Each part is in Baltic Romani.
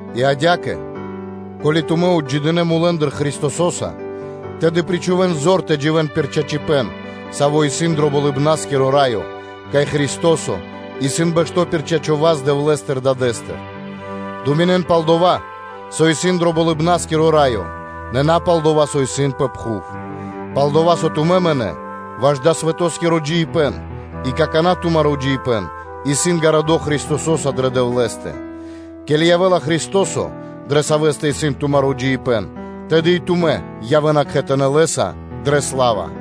И адя́кэ, ко́ли тумэ́ отджидынэ мулэ́ндыр Христосо́са, тэды причхувэ́н зор тэ дживэ́н пир чачипэ́н, саво́ исын дро Болыбна́скиро Раё, кай Христо́со исын бэшто́ пир чачо́ (право) васт Дэвлэ́стыр Дадэ́стыр. Думинэн (дэн годы́ пэ́скэ) пал дова́, со исын дро Болыбна́скиро Раё, нэ на пал дова́, со исын пэ пхув. Пал-дова́ со тумэ́ мынэ́ ваш дава́ свэтоскиро джиибэ́н и какана́ тумаро́ джиибэ́н исын гарадо́ Христосо́са дрэ Дэвлэ́стэ. Ке́ли явэ́ла Христо́со, дрэ Савэ́стэ исын тумаро́ джиибэ́н, тэды и тумэ́ явэ́на кхэтанэ́ Лэ́са дрэ сла́ва.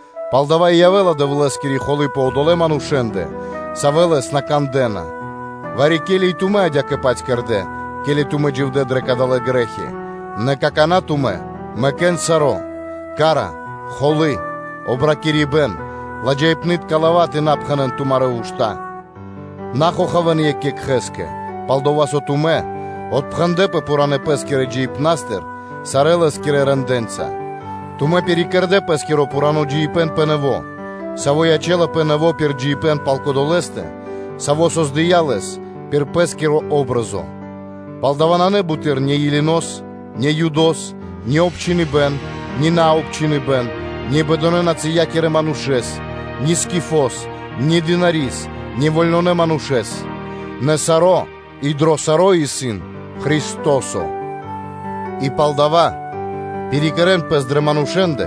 Палдава́ и явэ́ла Дэвлэ́скири холы́ пэ одолэ́ манушэ́ндэ, савэ́ Лэс на кандэ́на. Вари-ке́ли и тумэ́ адя́кэ-паць кэрдэ́, ке́ли тумэ́ дживдэ́ дрэ кадалэ́ грэ́хи. Нэ какана́ тумэ́ мэкэ́н саро́: холякирибэ́н, мижэхипэн (ярось), обракирибэн, ладжаипнытка лава́ тэ на пхэнэ́н тумарэ́ ушта́. На хохавэн екх екхэ́скэ, пал-дова́ со тумэ́ отпхэндлэпэ пхуранэ́ пэ́скирэ джиибнастыр сарэ́ лэ́скирэ рэндэ́нца. Тумэ́ пирикэрдэ пэ́скиро пхурано́ джиибэ́н пэ нэво́, саво́ ячэ́лапэ нэво́ пир джиныбэ́н пал Кодолэстэ, Саво́ создыя́ лэс пир Пэ́скири патри́н (о́бразо); палдава́ нанэ буты́р ни Елинос (Баламэс), ни Юдос, ни обчхиныбэн, ни наобчхиныбэн, ни бэдонэ-нацыякирэ манушэ́с, ни Скифос, ни дынари́с, ни вольнонэ манушэ́с, нэ саро́ и дро саро́ исын Христо́со. И палдава́ пирикэрэн пэс дрэ манушэ́ндэ,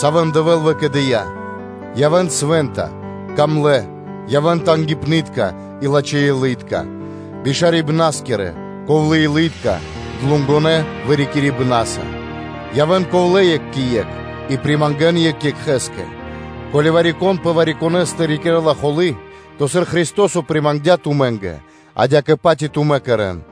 савэ́н Дэвэ́л выкэдыя́: явэ́н свэ́нта, дро́га, явэ́н тангипны́тка и лачхэ́-илытка, бишарибнаскирэ, ковлэ́-илы́тка, длугонэ вырикирибнаса; явэ́н ковлэ́ екх кэ екх и примангэн екх екхэ́скэ, ко́ли вари-кон пэ вари-конэ́стэ рикирэ́ла холы́; то сыр Христо́со примангдя тумэ́нгэ, адя́кэ-паць и тумэ́ кэрэ́н.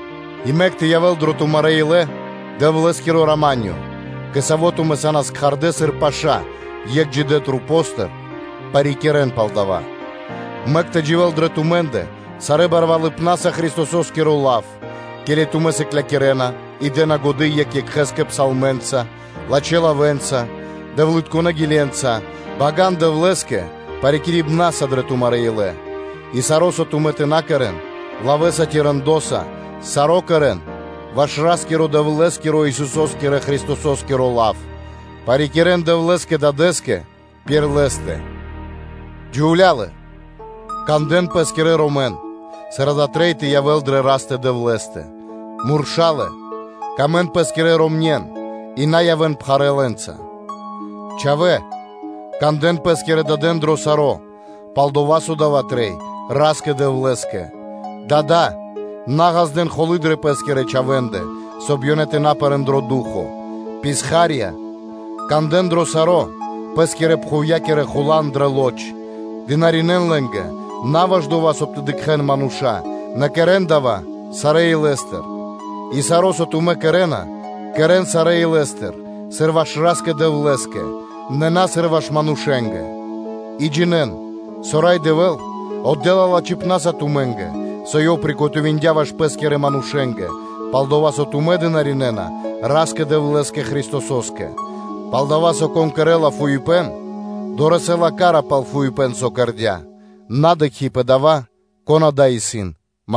И мэк тэ явэ́л дрэ тумарэ́ илэ Дэвлэ́скиро рама́нё (миро), кэ саво́ тумэ́ са́нас кхардэ́ сыр паша́ Екхэ Масэндыр, парикирэ́н пал дава́. Мэк тэ дживэ́л дрэ тумэ́ндэ сарэ́ барвалыпнаса Христосо́скиро лав, ке́ли тумэ́ сыклякирэ́на и дэ́на годы́ екх екхэ́скэ псалмэнца, лачхэ́ лавэ́нца, дэвлытконэ́ гиленца, бага́н Дэвлэ́скэ парикирибнаса дрэ тумарэ́ илэ. И саро́, соб (кай) тумэ́ тэ на кэрэ́н, лавэ́са ци рэндоса, саро́ кэрэ́н ваш Ра́скиро-Дэвлэ́скиро, Исусо́скирэ Христосо́скиро лав, парикирэ́н Дэвлэ́скэ Дадэ́скэ пир Лэ́стэ. Джувлялэ, кандэ́н Пэскирэн ромэн, сыр дава́ трэй тэ явэ́л дрэ Растэ – Дэвлэ́стэ. Мурша́лэ, явэ́н лачхэ́ кэ Пэ́скирэ ромня́, и на явэ́н пхарэ́ лэ́нца. Чхавэ́, кандэ́н пэ́скирэ дадэн дро саро́, пал-дова́ со дава́ трэй Ра́скэ Дэвлэ́скэ. Дадолэ, на ґаздэ́н холы́ дрэ пэ́скирэ чхавэ́ндэ, соб (кай) ёнэ тэ на пэрэ́н дро ду́хо (фа́но). Писхарьялэ, кандэ́н дро саро́ пэ́скирэ пхувья́кирэ хулан дрэ лоч, дынаринэ́н (служынэн) лэ́нгэ, на ваш дова́, соб (кай) тэ шарэ́н мануша́, нэ кэрэ́н дава́ сарэ́ илэ́стыр. И саро́, со тумэ́ кэрэ́на, кэрэ́н сарэ́ илэ́стыр, сыр ваш Ра́скэ-Дэвлэ́скэ, нэ на, сыр ваш манушэ́нгэ, и джинэ́н, со Рай Дэвэ́л отдэ́ла лачхипна́са тумэ́нгэ, со Ёв скэдыя́ ваш Пэ́скирэ манушэ́нгэ; пал-дова́ со тумэ́ дынаринэна Ра́скэ-Дэвлэ́скэ Христосо́скэ. Палдова́ со, кон кэрэ́ла фуипэ́н, дорэсэ́ла ка́ра пал фуипэ́н, со ёв кэрдя́, на дыкхи́ пэ дава́, кон адава́ ману́ш исын.